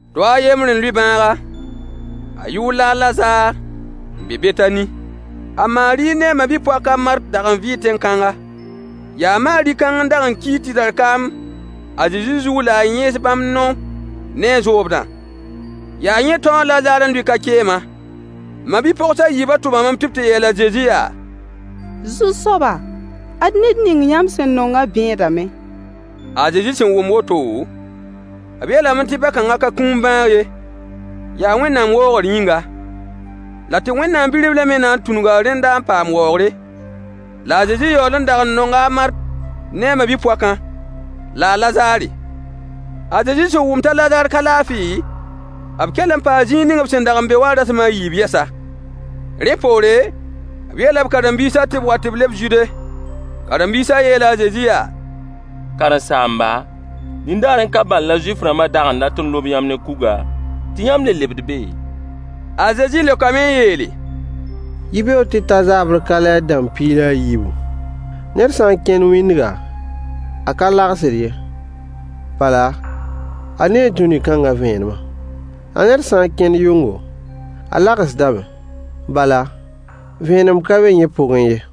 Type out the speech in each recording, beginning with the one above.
Dao a yembr n lʋɩ bãaga. A yʋʋr la a Lazaar, n be Betani. A Maari ne a ma-bi-poak a Mart dag n vɩɩ tẽn-kãnga. Yaa Maari kãng n dag n kiig tɩdar kaam a Zezi zug la a yẽes bãmb nao ne a zoobdã. Yaa yẽ tão a Lazaar n lʋɩ ka-keemã. Ma-bi-pogs a yiibã tʋmame tɩ b tɩ yeel a Zezi yaa: Zu-soaba, ad ned ning yãmb sẽn nongã bẽedame. A Zezi sẽn wʋm woto, b yeelame tɩ bã-kãngã ka kũum bãag ye, yaa Wẽnnaam waoogr yĩnga, la tɩ Wẽnnaam bi-riblã me na n tũnuga rẽnda n paam waoogre. La a Zezi yaool n dag n nonga a Mart ne a ma-bi-poakã, la a Lazaare. A Zezi sẽn wʋm t'a Lazaar ka laafɩ, b kell n paa zĩig ning b sẽn dag n be wã rasem a yiib yɛsa. Rẽ poore, b yeela b karen-biisã tɩ b wa tɩ b leb Zude. Karen-biisã yeela a Zezi yaa: Karen-saamba, nindaarẽ ka bal la Zuif-rãmbã dag n dat n lob yãmb ne kuga, tɩ yãmb le lebd be? A Zezi leokame n yeele: Yibeoog tɩ ta zaabr ka lɛɛr-dãmb piig la a yiibu? Ned sã n kẽnd wĩndga, a ka lagsd ye, bala, a nee dũni kãngã vẽenemã. La ned sã n kẽnd yʋngo, a lagsdame, bala, vẽenem ka be yẽ pʋgẽ ye.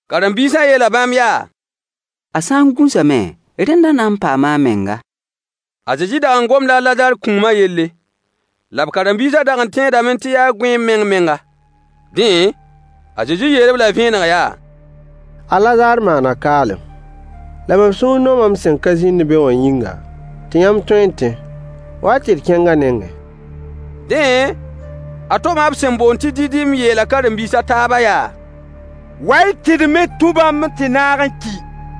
Karen-biisã yeela bãmb yaa: A sã n gũsame, rẽnda a na n paama a menga. A Zezi dag n gomda a Lazaar kũumã yelle, la b karen-biisã dag n tẽedame tɩ yaa gõeem meng-menga. Dẽ, a Zezi yeel-b-la vẽeneg yaa: A Lazaar maana kaalem. La mam sũur nooma m sẽn ka zĩnd be wã yĩnga, tɩ yãmb tõe n tẽ. Wa-y tɩ d kẽng a nengẽ. Dẽ, a Toma b sẽn boond tɩ Didim yeela karen-biis a taabã yaa: Wa-y tɩ d me tũ bãmb n tɩ naag n ki.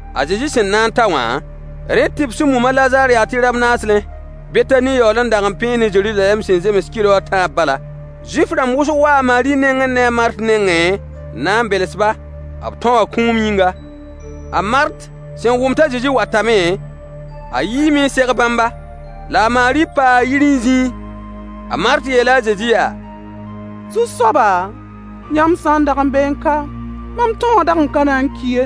A Zezi sẽn na n ta wã, rẽ tɩ b sẽn mum a Lazaar yaa tɩ rab-naaslẽ. Betani yaool n dag n pẽe ne Zeruzalɛm sẽn zems kɩlo a tãab bala. Zuif-rãmb wʋsg waa a Maari ne a Mart nengẽ n na n bels-ba, b tão wã kũum yĩnga. A Mart sẽn wʋm t'a Zezi watame, a yiime n seg bãmba, la a Maari paa yir n zĩẽ. A Mart yeela a Zezi yaa: Zu-soaba, yãmb sã n dag n beẽ ka, mam tão wã dag n ka na n ki ye.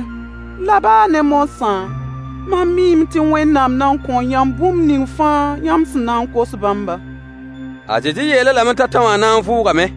La baa ne moasã, mam miime tɩ Wẽnnaam na n kõo yãmb bũmb ning fãa yãmb sẽn na kos bãmba. A Zezi yeel-a lame t'a tão wã na n vʋʋgame.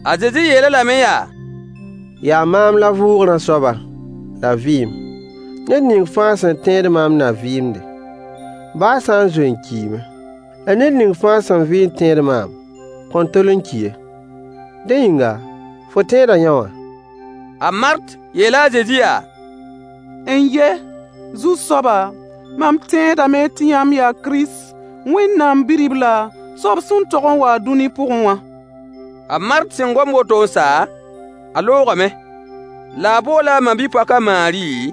A Zezi yeel-a lame yaa: Yaa maam la vʋʋgrã soaba, la vɩɩm. Ned ning fãa sẽn tẽed maam na vɩɩmde, baa a sã n zoe n kiime. La ned ning fãa sẽn vɩ n tẽed maam kõn tol n ki ye. Dẽ yĩnga, fo tẽeda yõwã? A Mart yeela a Zezi yaa: N-ye, Zu-soaba, mam tẽedame tɩ yãmb yaa Kirist, Wẽnnaam bi-riblã, soab sẽn tog n wa-a dũni pʋgẽ wã. A Mart sẽn gom woto n sa, a loogame. La a boola a ma-bi-poak a Maari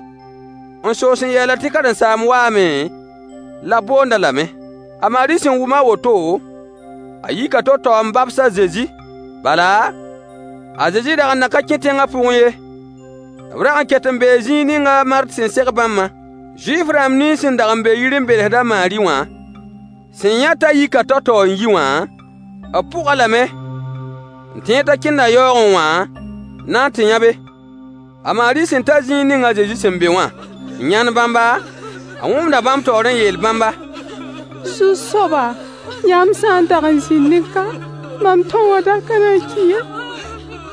n soos n yeel-a tɩ Karen-saamb waame la b boond-a lame. A Maari sẽn wʋm a woto, a yika tao-tao n babs a Zezi, bala, a Zezi dag n nan n ka kẽ tẽngã pʋgẽ ye, b rag n ket n bee zĩig ning a Mart sẽn seg bãmbã. Zuif-rãmb nins sẽn dag n be yir n belsd a Maari wã sẽn yã t'a yika tao-tao n yi wã, b pʋg-a lame, n tẽed t'a kẽnda yaoogẽ wã n na n tɩ yãbe. A Maari sẽn ta zĩig ning a Zezi sẽn be wã, n yãnd bãmba, a wõgemda bãmb taoor n yeel bãmba: Zu-soaba, yãmb sã n dag n zĩndẽ ka, mam tão wã dag n ka na n ki ye.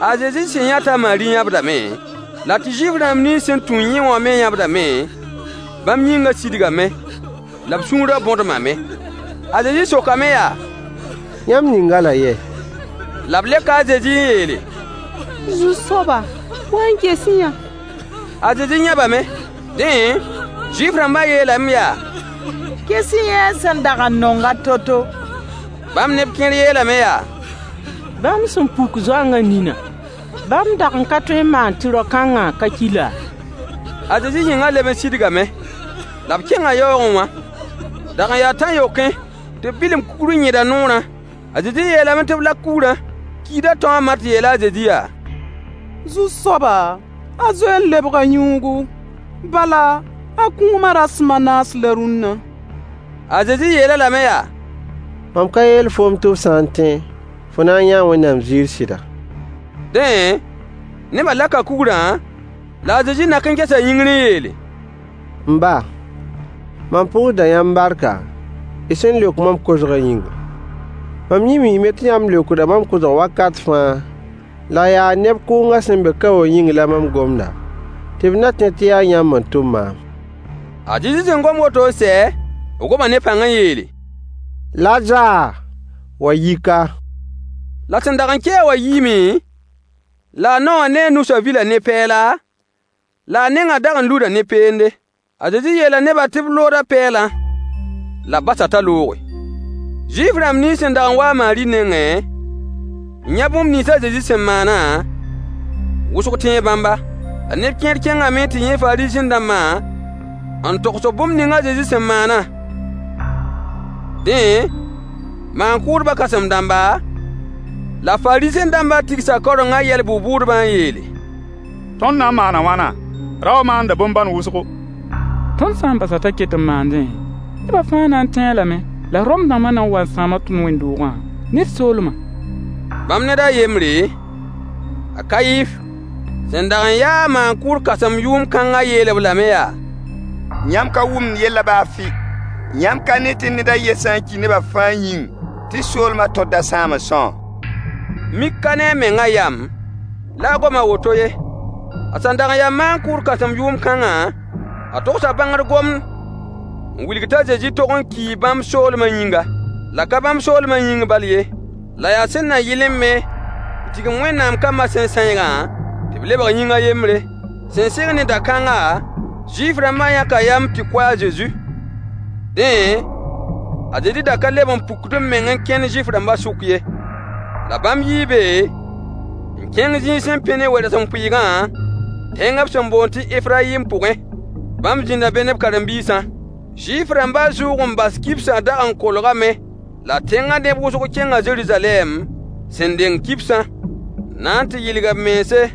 A Zezi sẽn yã t'a Maari yãbdame, la tɩ Zuif-rãmb nins sẽn tũ yẽ wã me yãbdame, bãmb yĩngã sidgame, la b sũurã bõdmame. A Zezi sokame ya: Yãmb ning-a-la yɛ? La b leoka a Zezi n yeele: Zu-soaba, wa n ges-y-yã. A Zezi yãbame. Dẽ, Zuif-rãmbã yeelame yaa: Ges-y-yã a sẽn dag n nong-a to-to! Bãmb neb kẽer yeelame yaa: Bãmb sẽn puk zoangã ninã, bãmb dag n ka tõe n maan tɩ rao-kãngã ka ki laa? A Zezi yĩngã leb n sidgame, la b kẽnga yaoogẽ wã. Dag n yaa tãn-yokẽ, tɩ b bilim kugr n yẽd a noorã. A Zezi yeelame tɩ b lak kugrã. Kiidã tão a Mart yeela a Zezi yaa: Zu-soaba, a zoe n lebga yũugu, bala, a kũumã rasem a naas la rũnna. A Zezi yeel-a lame yaa: Mam ka yeel foom tɩ fo sã n tẽ, fo na n yãa Wẽnnaam ziir sɩda? Dẽ, nebã laka kugrã, la a Zezi nak n gesa yĩngr n yeele: M ba, mam pʋʋsda yãmb barka, y sẽn leok mam kosgã yĩnga. Mam yẽ miime tɩ yãmb leokda mam kosg wakat fãa, la yaa neb kʋʋngã sẽn be ka wã yĩng la mam gomda, tɩ b na tẽ tɩ yaa yãmb n tʋm maam. A Zezi sẽn gom woto n sɛ, b goma ne pãng n yeele: Lazaar, wa yi ka! La sẽn dag n ki-a wã yiime, la a nao wã ne a nusã vila ne pɛɛla, la a nengã dag n luda ne peende. A Zezi yeela nebã tɩ b lood a pɛɛlã, la b bas-a t'a looge. Zuif-rãmb nins sẽn dag n wa a Maari nengẽ, n yã bũmb nins a Zezi sẽn maanã, wʋsg tẽe bãmba. La neb kẽer kẽngame n tɩ yã Fariisẽ-dãmbã n togs-b bũmb ning a Zezi sẽn maanã. Dẽ, maan-kʋʋdbã kãsem-dãmba, la Faariisẽ-dãmbã tigsa kaorengã yɛl bʋ-bʋʋdbã n yeele: Tõnd na n maana a wãna? Rao wã maanda bõn-bãn wʋsgo. Tõnd sã n bas-a t'a ket n maandẽ, nebã fãa na n tẽe-a lame, la Rome dãmbã na n waa n sãama tõnd wẽnd-doogã ne d soolmã. Bãmb ned a yembre, a Kayif, sẽn dag n ya-a maan-kʋʋd kãsem yʋʋm kãngã yeel-b lame yaa: Yãmb ka wʋmd yellã baa fɩ. Yãmb ka ne tɩ ned a yen sã n ki nebã fãa yĩng tɩ soolmã tõr da sãam n são? Mik ka ne a mengã yam la a gom a woto ye. A sẽn dag n ya maan-kʋʋd kãsem yʋʋm kãngã, a togsa bãngr gomd n wilg t'a Zezi tog n kii bãmb soolmã yĩnga. La ka bãmb soolmã yĩng bal ye, la yaa sẽn na yɩlẽ me n tigim Wẽnnaam kambã sẽn sãeegã, tɩ b lebg yĩng a yembre. Sẽn sɩng ne da-kãnga, Zuif-rãmbã yãka yam tɩ kʋ a Zezi. Dẽ, a Zezi da ka leb n pukd b meng n kẽnd Zuif-rãmbã sʋk ye. La bãmb yii be n kẽng zĩig sẽn pẽ ne we-rasempʋɩɩgã, tẽng b sẽn boond tɩ Efrayim pʋgẽ. Bãmb zĩnda be ne b karen-biisã. Zuif-rãmbã zʋʋg-n-bas kibsa dag n kolgame, la tẽngã neb wʋsg kẽnga Zeruzalɛm, sẽn deng kibsã, n na n tɩ yɩlg b mense.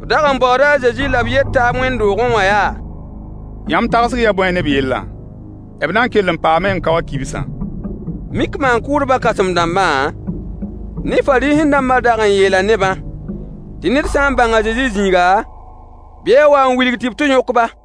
B dag n baooda a Zezi la b yet taab wẽnd-doogẽ wã yaa: Yãmb tagsg yaa bõe ne b yellã? B na n kell n paame n ka wa kibsã? Mik maan-kʋʋdbã kãsem-dãmbã ne Fariisẽ-dãmbã dag n yeela nebã tɩ ned sã n bãng a Zezi zĩiga, bɩ a wa n wilg tɩ b tɩ yõk-ba.